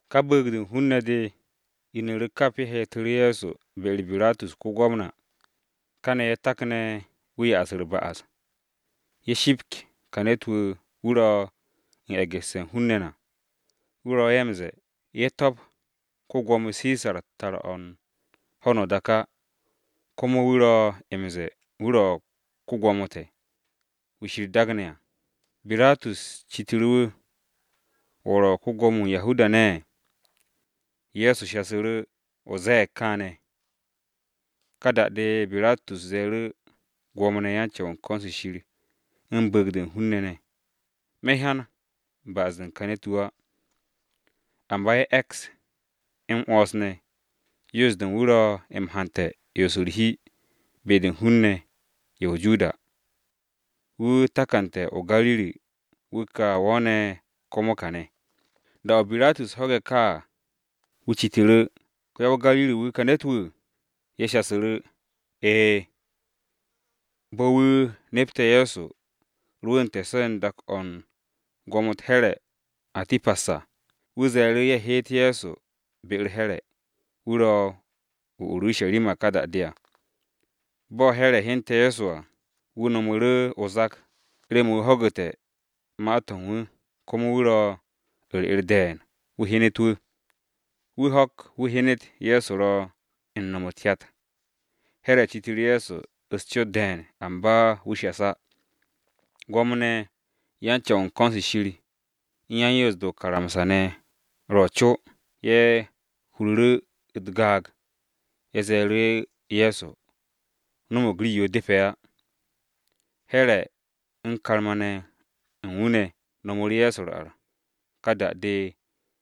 Ka bu̱u̱g-de u̱n hun-ne̱ de inu̱ru̱ kap ye̱ heetu̱ru̱ Ye̱so be-u̱r Biratus ko-Gwamna. Kane̱ ye̱ takne̱ wu̱ sakke̱ u̱t-ba'as. “Te̱ shipk ka ne̱t-wu̱, wu̱ ro̱ u̱n e̱gu̱sse̱ u̱n hun-ne̱ na, wu̱ ro̱ ye̱ m-ze̱e̱, ye̱ to̱p ko-Gwo̱mo Sisar tar-o̱ u̱n ho̱no o-dak á, komo wu̱ ro̱ m-ze̱e̱, wu̱ ro̱ ko-Gwo̱mo te̱, Kiristi.” Biratus citu̱ru̱ wu̱, “¿Wo̱ ro̱ ko-Gwo̱mo-wu̱ u̱n Yahuda-ne̱?” Ye̱so shasu̱ru̱, “O ze̱e̱g kaane̱.” Ka da-de Biratus ze̱e̱ru̱ Gwo̱mo-ne̱ ye̱ u̱n ko̱n-se Shir u̱n bu̱u̱g-de u̱n hun-ne̱, “Me̱ hyan ba'as-de u̱n ka ne̱t-wu̱ á.” Amba ye̱ e̱ks m-'wo̱ns ne̱, “Yoos-de u̱n wu̱ ro̱ m-hante̱ 'yons u̱r-hi be-de u̱n hun-ne̱ ye̱ o-Judiya. Wu̱ takante̱ o-Gariri wu̱ ka wo̱o̱ne̱ komo kane̱.” Da-o̱ ko-Gwamna Biratus ho̱ge̱ de ka à, wu̱ citu̱ru̱, “¿Ko-ya-o-Gariri-wu̱, ka ne̱t-wu̱?” Ye̱ shasu̱ru̱, “E̱e̱.” Bo̱ wu̱ nepte̱ Ye̱so rwu̱u̱nte̱ so̱ u̱n dak-o̱ u̱n gwo̱mo-u̱t Here̱ [Atipas] à, wu̱ ze̱e̱ru̱ ye̱ heet Ye̱so be-u̱r Here̱, wu̱ ro o-Urusharima ka da-de à. Bo̱ Here̱ hyente̱ Ye̱so à, wu̱ no̱mu̱ru̱ o-zak remen wu̱ ho̱gu̱te̱ ma-to̱ u̱n wu̱, komo wu̱ ro u̱r-'er de̱e̱n wu̱ hyenet wu̱. Wu̱ ho̱k wu̱ hyenet Ye̱so ro̱ u̱n no̱m u̱t-hyat. Here̱ citu̱ru̱ Ye̱so u̱s-cot de̱e̱n, amba wu̱ shas á. Gwo̱mo-ne̱ ye̱ u̱n ko̱n-se Shir u̱n yan-Yoos-de o-karamsa ne̱ ro̱ co, ye̱ hururu̱ u̱t-gaag, ye̱ ze̱e̱ru̱ Ye̱so no̱mo̱g rii-yo depe̱ á. Here̱ u̱n karma-ne̱ u̱n wu̱ ne̱ no̱mu̱ru̱ Ye̱so u̱r-ar. Ka da-de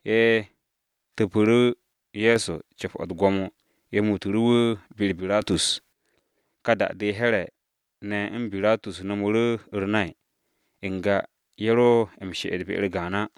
ye̱ tu̱pu̱ru̱ Ye̱so co̱p-o̱ u̱t-gwo̱mo ye̱ muutu̱ru̱ wu̱ be-u̱r Biratus. Ka ho̱-de Here̱ ne̱ u̱n Biratus no̱mu̱ru̱ u̱r-nay, n-ga ye̱ ro m-she'et be-u̱r gaan á.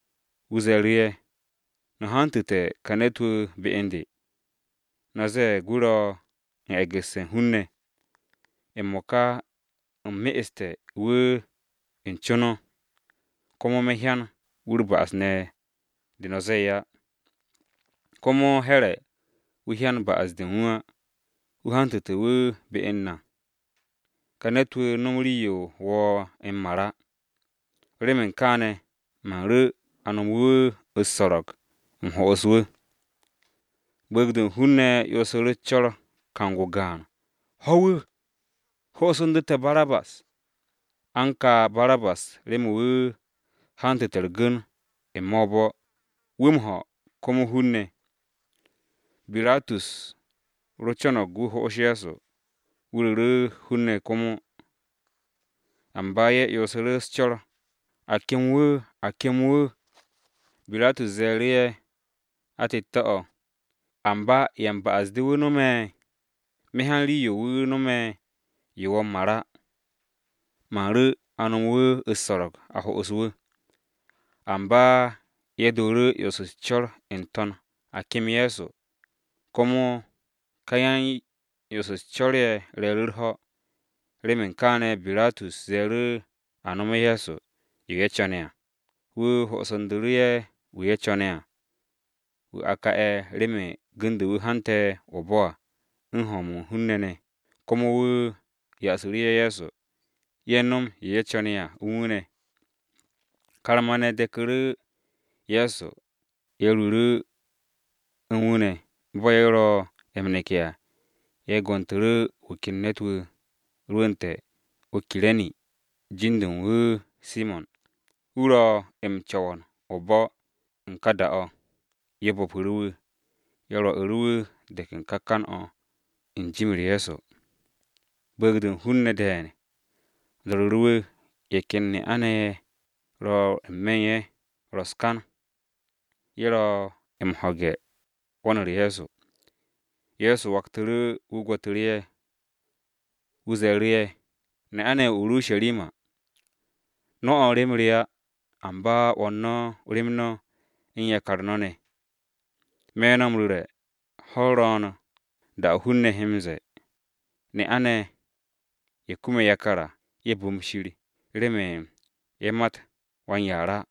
Wu̱ ze̱e̱ru̱ ye̱, “No̱ hantu̱te̱ ka ne̱t-wu̱ be u̱n de. No̱ zee wu̱ ro̱ u̱n e̱gu̱sse̱ u̱n hun-ne̱. M-mo̱ka u̱m me'este̱ wu̱ u̱n co no̱. Komo me̱ hyan wu̱ u̱r-ba'as ne̱ de no̱ ze̱e̱ á. Komo Here̱ wu̱ hyan ba'as-de u̱n wu̱ á, wu̱ hantu̱te̱ wu̱ be u̱n na. Ka ne̱t-wu̱ no̱m rii-yo wo̱o̱ m-mar á. Remen kaane̱ man ru̱ a nomu̱ wu̱ u̱s-so̱ro̱g, u̱m ho'os wu̱.” Bu̱u̱g-de u̱n hun-ne̱ 'yonsu̱ru̱ u̱s-co̱r kang-o gaan, “Ho̱ wu̱! Hosu̱ndu̱ te̱ Barabas!” (A u̱n ka Barabas remen wu̱ hantu̱te̱ u̱r-gu̱n n-me̱ o-bo̱, wu̱ hoom komo hun-ne̱.) Biratus ro co̱no̱g wu̱ ho'os Ye̱so, wu̱ ru̱ru̱ hun-ne̱ komo. Amba ye̱ 'yonsu̱ru̱ u̱s-co̱r, “A kem wu̱! A kem wu̱!” Biratus ze̱e̱ru̱ ye̱ atette̱-o̱, “Amba, ¿ya u̱n ba'as-de wu̱ no̱m? Me̱ hyan rii-yo wu̱ no̱me̱ yo wo̱o̱ m-mar á! Man ru̱ a no̱mu̱ wu̱ u̱s-so̱ro̱g a ho'os wu̱.” Amba ye̱ dooru̱ 'yons u̱s-co̱r n-to̱n a kem Ye̱so, komo ka yan-'yons u̱s-co̱r ye̱ re̱e̱ru̱ u̱r-ho̱. Remen kaane̱ Biratus ze̱e̱ru̱, a no̱me̱ Ye̱so, yo ye̱ co̱ne̱ à. Wu̱ hosu̱ndu̱ru̱ ye̱ wu̱ ye̱ co̱ne̱ à, wu̱ a ka'e̱ remen gu̱n-de wu̱ hante̱ o-bo̱ à u̱n hoom u̱n hun-ne̱ ne̱, komo wu̱ yasu̱ru̱ ye̱ Ye̱so, ye̱ no̱m yo ye̱ co̱ne̱ à u̱n wu̱ ne̱. Karma-ne̱ deku̱ru̱ Ye̱so ye̱ ruuru̱ u̱n wu̱ ne̱. Bo̱ ye̱ ro m-neke̱ à, ye̱ go̱ntu̱ru̱ wu̱ ken ne̱t-wu̱ rwu̱nte̱ o-Kire̱ni jin-de u̱n wu̱ Simo̱n, wu̱ ro̱ m-co̱wo̱n o-bo̱ u̱n ka dak-o̱. Ye̱ bo̱pu̱ru̱ wu̱, ye̱ rwo̱'u̱ru̱ wu̱ de̱k u̱n ka kan-o̱, u̱n jim-u̱r Ye̱so. Bu̱u̱g-de u̱n hun-ne̱ de̱e̱n do̱ru̱ru̱ wu̱, ye̱ ken ne'a-ne̱ ye̱ ro n-me̱ ye̱ ro̱ u̱s-kan. Ye̱ ro̱ m-ho̱ge̱ 'wo̱n-u̱r Ye̱so. Ye̱so waktu̱ru̱, wu̱ gwo̱tu̱ru̱ ye̱. Wu̱ ze̱e̱ru̱ ye̱, “Ne'a-ne̱ ye̱ o-Urusharima! No̱ 'wo̱n rem re á, amba 'wo̱n no̱ rem no̱, u̱n yakar no̱ ne̱. Me̱ no̱ m-ru̱re̱ ho̱-u̱r ro̱o̱n, da-o̱ hun-ne̱ he m-ze̱e̱, ‘Ne'a-ne̱ ye̱ kume̱ yakar á, ye̱ bu̱m Shir remen ye̱ mat wan-yaar á.’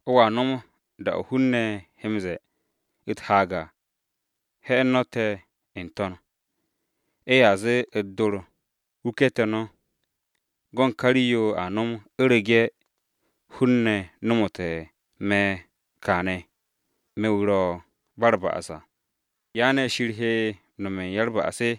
O̱a no̱m da-o̱ hun-ne̱ he m-ze̱e̱ u̱t-haag à ‘He̱'e̱n no̱ te̱ n-to̱n!’ Ye̱a zee u̱t-dor, ‘Wuke̱ te̱ no̱!’ Go̱n ka rii-yo a nom, u̱rege̱ hun-ne̱ no̱mo̱te̱ me̱ kaane̱, me̱ wu̱ ro̱ ba u̱r-ba'as à, ¿ya ne̱ Shir he nome̱ u̱n ya-u̱r-ba'as?”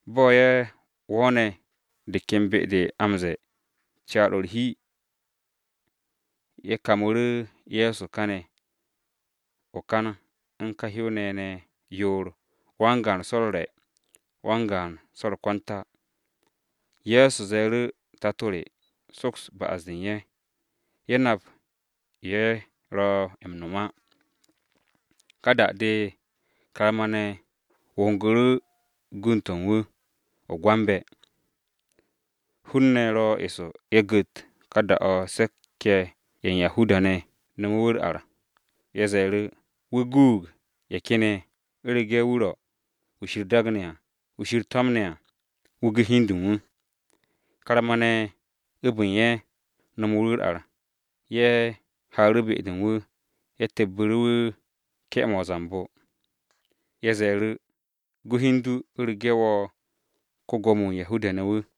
Bo̱ ye̱ wo̱o̱ne̱ de ken be-de a m-ze̱e̱, Caar-o̱ u̱r-hi, ye̱ kamu̱ru̱ Ye̱so kane̱ o-kan u̱n ka hyow-ne̱ ye̱ ne̱ yoor, wan-gaan so̱ u̱r-re̱, wan-gaan so̱ u̱r-kwanta. Ye̱so ze̱e̱ru̱, “Tato re, soks ba'as-de u̱n ye̱! Ye̱ nap yo ye̱ ro̱ m-no̱m á.” Ka da-de karma-ne̱ wo̱ngu̱ru̱ gund-to̱ u̱n wu̱ o-gwambe̱. Hun-ne̱ ro̱ eso ye̱ gu̱t, da-o̱ caari-ye̱ ye̱ u̱n Yahuda-ne̱ nome̱ wu̱ u̱r-ar à. Ye̱ ze̱e̱ru̱, “Wu̱ guug ye̱ ken ye̱, u̱rege̱ wu̱ ro̱ Kiristi wu̱ Shir to̱mne̱ à, wu̱ gu hi u̱n de u̱n wu̱.” Karma-ne̱ abu̱n ye̱, nomu̱ru̱ wu̱ u̱r-ar, ye̱ haaru̱ be-de u̱n wu̱. Ye̱ tepbu̱ru̱ wu̱ ke̱-mo̱ o-zambo. Ye̱ ze̱e̱ru̱, “Gu hi u̱n du u̱rege̱ wo̱ ko-Gwo̱mo-wu̱ u̱n Yahuda-ne̱ wu̱!”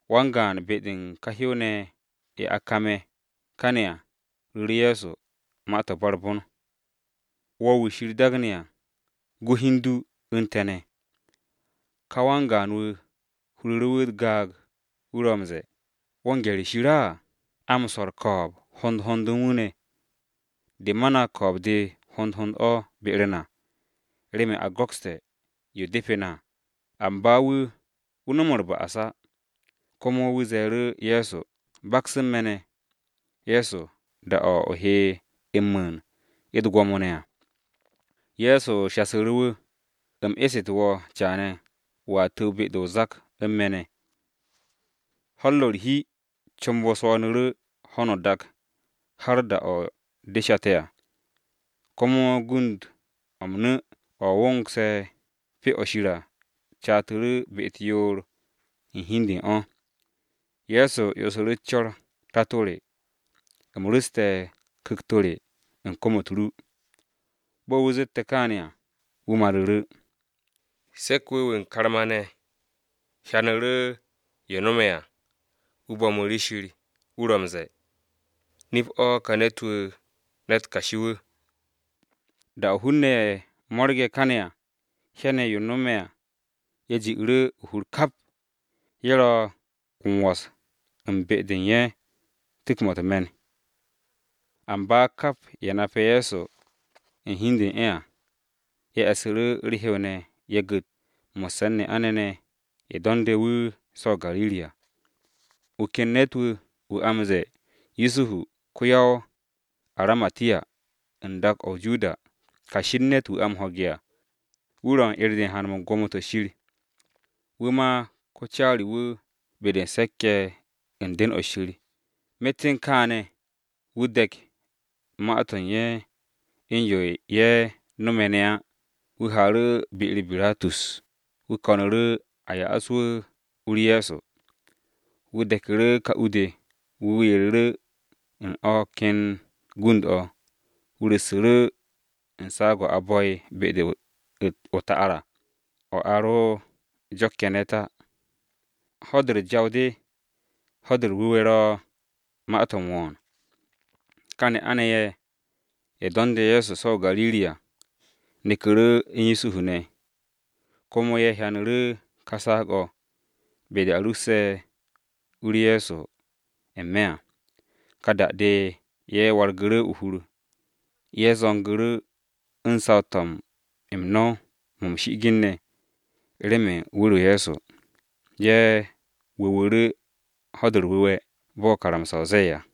Wan-gaan be-de u̱n ka hyow-ne̱ ye̱, ye̱ a kame̱ kane̱ à, ru̱ru̱ Ye̱so ma-to̱ ba u̱r-bon: “¿Wo̱ wu̱ ka ro̱ Kiristi á? Gu hi u̱n du u̱n te̱ ne̱!” Ka wan-gaan-wu̱, huru̱ru̱ wu̱ u̱t-gaag, wu̱ ro̱ m-ze̱e̱, “¿Wo̱ u̱n gye̱r u̱n Shir á? A m-swo̱ u̱r-ko̱o̱b hond hond u̱n wu̱ ne̱. De ma na ko̱o̱b-de hond hond o̱ be-u̱r na, remen a go̱kste̱ yo depe̱ na à, amba wu̱, wu̱ no̱m u̱r-ba'as á.” Komo wu̱ ze̱e̱ru̱ Ye̱so, “Ye̱so, baks u̱n me̱ ne̱, da-o̱ o he m-mu̱u̱n u̱t-gwo̱mo ne̱ à!” Ye̱so shasu̱ru̱ wu̱, “U̱m esu̱te̱ wo̱ caane̱, wo̱a tu̱w be-de o-zak u̱n me̱ ne̱.” Ho̱-u̱r ro̱ u̱r-hi, comb-o swo̱o̱nu̱ru̱ ho̱no o-dak har da-o de shate̱ à. Komo gund-o̱ m-nu̱ o̱ wo̱ngse̱ Pyo-o̱ Shir à catu̱ru̱ be-u̱t yoor u̱n hi u̱n de u̱n o̱. Ye̱so 'yonsu̱ru̱ u̱s-co̱r, “Tato re! U̱m ru̱ste̱ ku̱kt-to̱ re u̱n kom-u̱t ru!” Bo̱ wu̱ zette̱ kaane̱ à, wu̱ maru̱ru̱. Se̱k-wu̱ wu̱ u̱n karma-ne̱ hyanu̱ru̱ yo no̱me̱ à, wu̱ bo̱mu̱ru̱ Shir, wu̱ ro̱ m-ze̱e̱, “Nip-o̱ ka ne̱t-wu̱ ne̱t kashi-wu̱!” Da-o̱ hun-ne̱ ye̱ mo̱rge̱ kane̱ à, hyane̱ yo no̱me̱ à, ye̱ ji'u̱ru̱ o-hur kap. Ye̱ ro̱ u̱n wo̱s u̱n be-de u̱n ye̱ u̱n tu̱k-mo̱ u̱t-me̱n. Amba kap ye̱ nape̱ Ye̱so u̱n hi u̱n de u̱n ye̱ à, ye̱ e̱ssu̱ru̱ u̱r-hew ne̱ ye̱ gu̱t, mo̱sse̱ u̱n ne'a-ne̱ ne̱ ye̱ do̱nde̱ wu̱ so̱ o-Gariri à. Wu̱ ken ne̱t-wu̱, wu̱ a m-ze̱e̱ Yusuhu ko-ya-o-Aramatiya, u̱n dak-o̱ o-Judiya. Kashi u̱n ne̱t-wu̱ a m-ho̱ge̱ à, wu̱ ro̱ u̱n 'er-de u̱n haan-mo̱ u̱n gwo̱mo-to̱ Shir. Wu̱ ma ko-caari-wu̱ be-de u̱n se̱k-ye̱ u̱n den-o Shir, myet u̱n kaane̱ wu̱ de̱k ma-to̱ u̱n ye̱, u̱n yo ye̱ no̱me̱ ne̱ á. Wu̱ haaru̱ be-u̱r Biratus wu̱ ko̱nu̱ru̱ a ya'as wu̱ u-u̱r Ye̱so. Wu̱ de̱ku̱ru̱ ka u-de, wu̱ yereru̱ u̱n o̱ ken gund-o̱, wu̱ ru̱ssu̱ru̱ u̱n saag-o̱ a bo̱'e̱ be-de o-ta'ar à, o̱ a ro jo̱kke̱ ne̱t á. Ho̱-de u̱r-Jaw de, Ho̱-de u̱r-Wu̱we̱ ro̱ ma-to̱ u̱n wo̱o̱n. Ka ne'a-ne̱ ye̱, ye̱ do̱nde̱ Ye̱so so̱ o-Gariri à, neku̱ru̱ u̱n Yusuhu ne̱. Komo ye̱ hyanu̱ru̱ ka saag-o̱, be-de a ru̱sse̱ u-u̱r Ye̱so n-me̱ à. Ka da-de ye̱ wargu̱ru̱ o-hur, ye̱ zo̱ngu̱ru̱ u̱n saw-to̱ m-no̱w mo̱ m-shi'igin ne̱, remen wu̱r-o Ye̱so. Ye̱ wu̱wu̱ru̱ Ho̱-de u̱r-Wu̱we̱, bo̱ karamsa-o ze̱e̱ à.